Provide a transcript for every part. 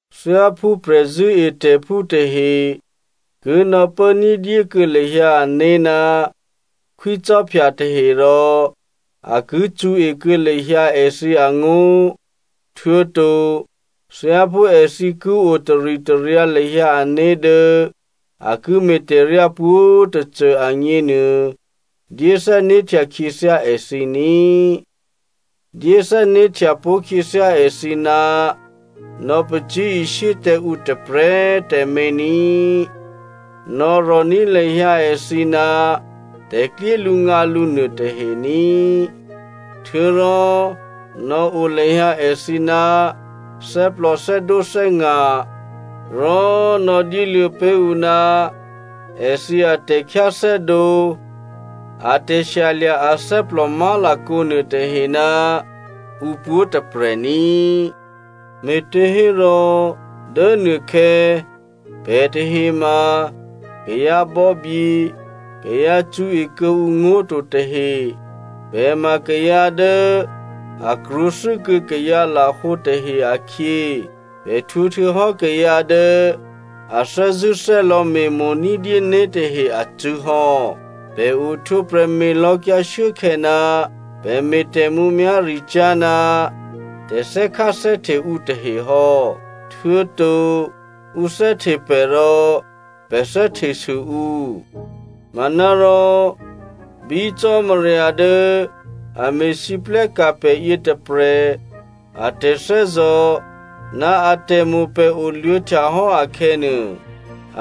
Thyáphú prè̤zṳ̂́etè̤phú tahe ki nò̌pố ní̤dyé kuô̌ lahyǎ ané̤ ná khwícò́phya tahe rò a ki cṳ̌e kuô̌ lahyǎ èthǐ angó̤, htuô̌to thyáphú èthǐ ki o taritaryǎ lahyǎ ané̤ dố a ki me̤tè̤ryá pwǒ̤꤮ tôcô agněnuô, dyé thè́né̤htya khyěthyá èthǐ ní꤮. Dyé thè́né̤htya pó̤khyěthyá èthǐ ná nò̌pacyé̤ishyé tǎ ǔ tôprè̤꤮ tǎmé̤ ní꤮. Nò̌rò̤ní̤ lahyǎ èthǐ ná tè̤klyélǔngǎlǔ nuôtahe ní꤮. Htuô̌rò nò̌o lahyǎ èthǐ ná thè́plò thè́dǒthè́nga̤, rò nò̌dyéluô̌ pé̤ ǔ ná èthǐ atè̤khyáthè́dǒ a tè̤shyalya̤ athè́plò má̤lakǒ nuôtahe ná ǔpwǒ̤꤮ tôprè̤ ní꤮. Me̤těhérò dố nuôkhè̌ pè̤ tahe ma kayǎbò̌bye kayǎ cṳ̌e kuô̌ǔ ngó̤ to tahe. Pè̤ ma kayǎ dố a krwǒthû́kuô̌ kayǎ lahǒ tahe akhyě. Pè̤ htwǒ htuô̌hò́ kayǎ dố a thè́zṳ̂́thè́lò̌ me̤mo̤ ní̤dyé né̤ tahe acṳ̂́ hò́. Pè̤ ohtwǒprè̤ me̤lò̌kyǎ shuốkhè̌ ná pè̤ me̤ tè̤mǔmyá̤ricyá̤ ná tè̤thè́kháthè́hte ǔ tahe hò́. Htuô̌to ǔ thè́hte pè̤ rò pè̤ thè́htesû ǔ. Manárò bí Cò́marya dố a me̤lwóhteka̤ pè̤ yětôprè̤ a tè̤thè́zò̤ ná atè̤mo̤ pè̤ oluô̌htya hò́ akhè̌nuô,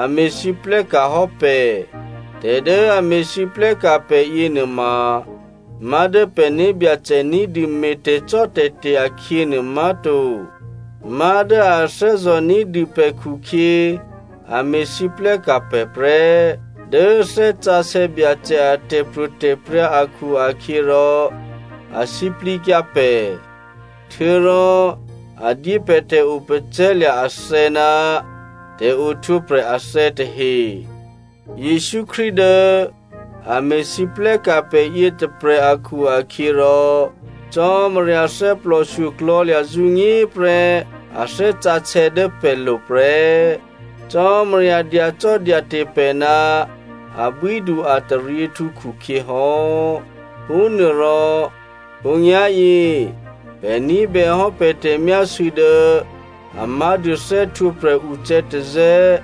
a me̤lwóhteka̤ hò́ pè̤. Tè̤dố a me̤lwóhteka̤ pè̤ yěnuôma má̤dố pè̤ né̤byacè ní̤dû me̤ tè̤cò́tè̤te̤ akhyě nuô má̤to, má̤dố a thè́zò̤ ní̤dû pè̤ khukhyě a me̤lwóhteka̤ pè̤ prè́. Dố Thè́ Sǎsè̌ Byacè a tè̤pro̤tè̤prya̤ akhu-akhyěrò a sǐplǐkyǎ pè̤, htuô̌rò a dyé pè̤ tè̤opacè̤̌lya̤ athè̌ ná tè̤ohtwǒprè̤ athè̌ tahe. Jesǔ Krístu dố a me̤lwóhteka̤ pè̤ yětôprè̤ akhu-akhyěrò, Cò́marya thè́plòshyo klò̤̌lya̤ zǔnyéprè́ a Thè́ Sǎsè̌ dố pè̤lo̤ prè́. Cò́marya dyacò́dyate̤ pè̤ ná abwídu-ataryěhtǔ khukhyě hò́. Phúnuôrò khǒnyá̤yě pè̤ ní̤bèhò́ pè̤ tè̤myásû̌ dố a má̤dû thè́htwǒprè̤ ucè̌tazè̌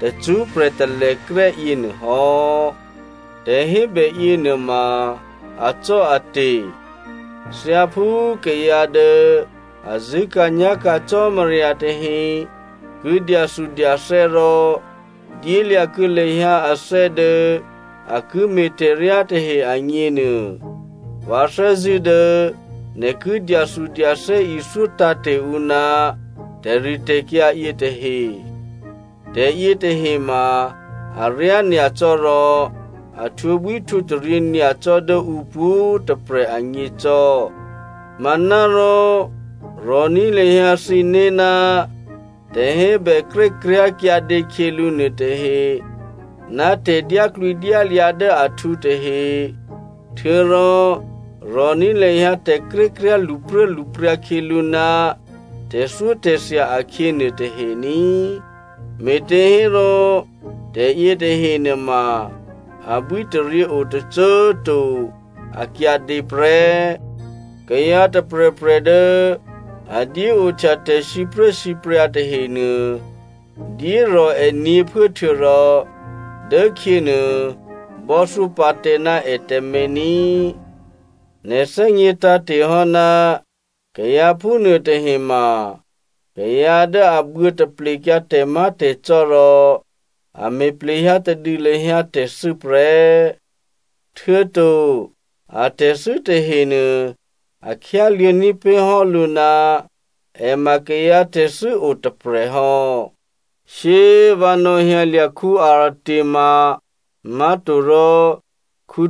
tacṳ́prè̤ talèkrè́ yěnuô hò́. Tè̤hébè yěnuôma acò́ate̤. Thyáphú kayǎ dố a zṳ̂́ka̤nyá̤ka̤ Cò́marya tahe ki dyathudyathè́ rò dyélya̤kuô̌ lahyǎ athè́ dố a ki me̤ tè̤ryá tahe agněnuô, vǎ thè́zṳ̂́ dố nè̤ ki dyathudyathè́ ithyó tǎ̤te̤ ǔ ná tè̤ritè̤kyǎ yětahe. Tè̤yětahe ma aryá nyacò́ rò a htwǒbwíhtwǒtaryě nyacò́ dố ǔ pwǒ̤꤮ tôprè̤ agně cò́. Manárò rò̤ní̤ lahyǎ thǐné̤ ná tè̤hébè krékryá̤ kyǎdě khyělǔ nuôtahe ná tè̤dyáklwǐdyályǎ dố ahtǔ tahe. Htuô̌rò rò̤ní̤ lahyǎ tè̤krékryá̤ lṳpruốlṳpryǎ khyělǔ ná tè̤thyótè̤thya akhyě nuôtahe ní꤮, me̤těhérò tè̤ yětahe nuôma abwítaryě o tôcô꤮ to. A kyǎdě prè́. Kayǎ tôprè̤prè̤ dố a dyé ohtya tè̤sipruốsipryǎ tahenuô, dyérò̤ è nyě̤phuố htuô̌rò dố khyě nuô bò́thyó pǎ tǎ ná è tǎmé̤ ní꤮. Nè̤ thè́gně tǎ̤te̤ hò́ ná kayǎ phúnuô tahe ma kayǎ dố a buô̌taplekyǎ tè̤má̤tè̤cò́ rò a me̤ plehyǎ tadû lahyǎ tè̤thû́ prè́. Htuô̌to atè̤thû́ tahenuô a khyáluô̌ ní̤pé̤ hò́ lǔ ná è ma kayǎ tè̤thû́o tôprè̤hò́. Shyé꤮ vǎ nò̌hyǎlya̤ Artema má̤torò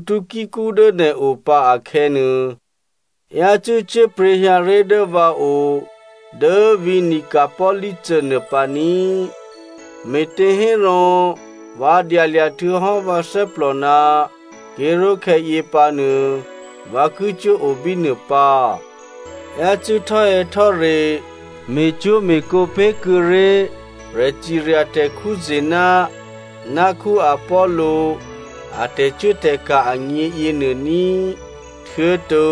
Tykico dố nè̤o pǎ akhè̌nuô, yácû́ cyé̤pryě̤ hyǎ ré̤ dố vǎo dố vǐ̤ Nicopoli nuô pǎ ní꤮, me̤těhérò vǎ dyalya̤ htuô̌hò́ vǎ thè́plò ná ké̤ró̤khè̌ yěpǎnuô, vǎ ki cuốo bínuô pǎ. Yácû́ htò́hè̌htò́re me̤cwó̤me̤kǒ pé̤kuô̌ré̤ prè̤cirya tè̤ Zena ná Apollo a tè̤cuốtè̤ka̤ agně yěnuô ní꤮. Htuô̌to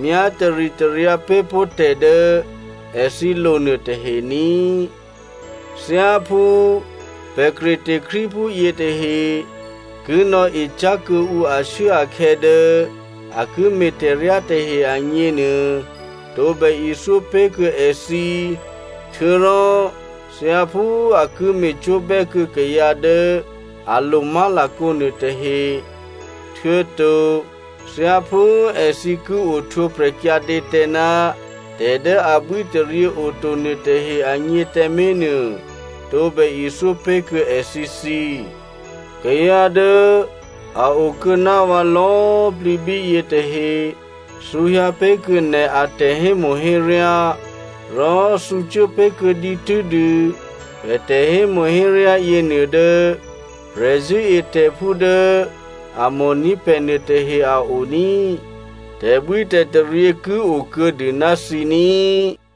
myá taritaryǎ pé̤ pó̤ tè̤ dố èthǐ lo nuôtahe ní꤮. Thyáphú pè̤ Crete Krístuphú yětahe ki nò̌ecyá̤ kuô̌ǔ ashuốakhè̌ dố a ki me̤ tè̤ryá tahe agněnuô, tǒbè ithyó pé̤kuô̌ èthǐ htuô̌rò thyáphú a ki me̤cwó̤bè́ pé̤kuô̌ kayǎ dố a lo má̤lakǒ nuôtahe, htuô̌to thyáphú èthǐ ki ohtwǒprè̤ kyǎdě tǎ ná tè̤ dố abwítaryě oto nuôtahe agně tǎmé̤nuô, tǒbè ithyó pé̤kuô̌ èthǐthǐ. Kayǎ dố a okuô̌ ná vǎ lò̌꤮ plǐ bíyě tahe thǔhyǎ pé̤kuô̌ nè̤ atè̤hémo̤héryá. Rò thǔcuố pé̤kuô̌ dǐtû́dû pè̤ tè̤hémo̤héryá yěnuô dố prè̤zṳ̂́etè̤phú dố a mo̤ní̤ pè̤ nuôtahe a o ní꤮. Tè̤bwítè̤taryě ki o kuô̌dû ná thǐ ní꤮.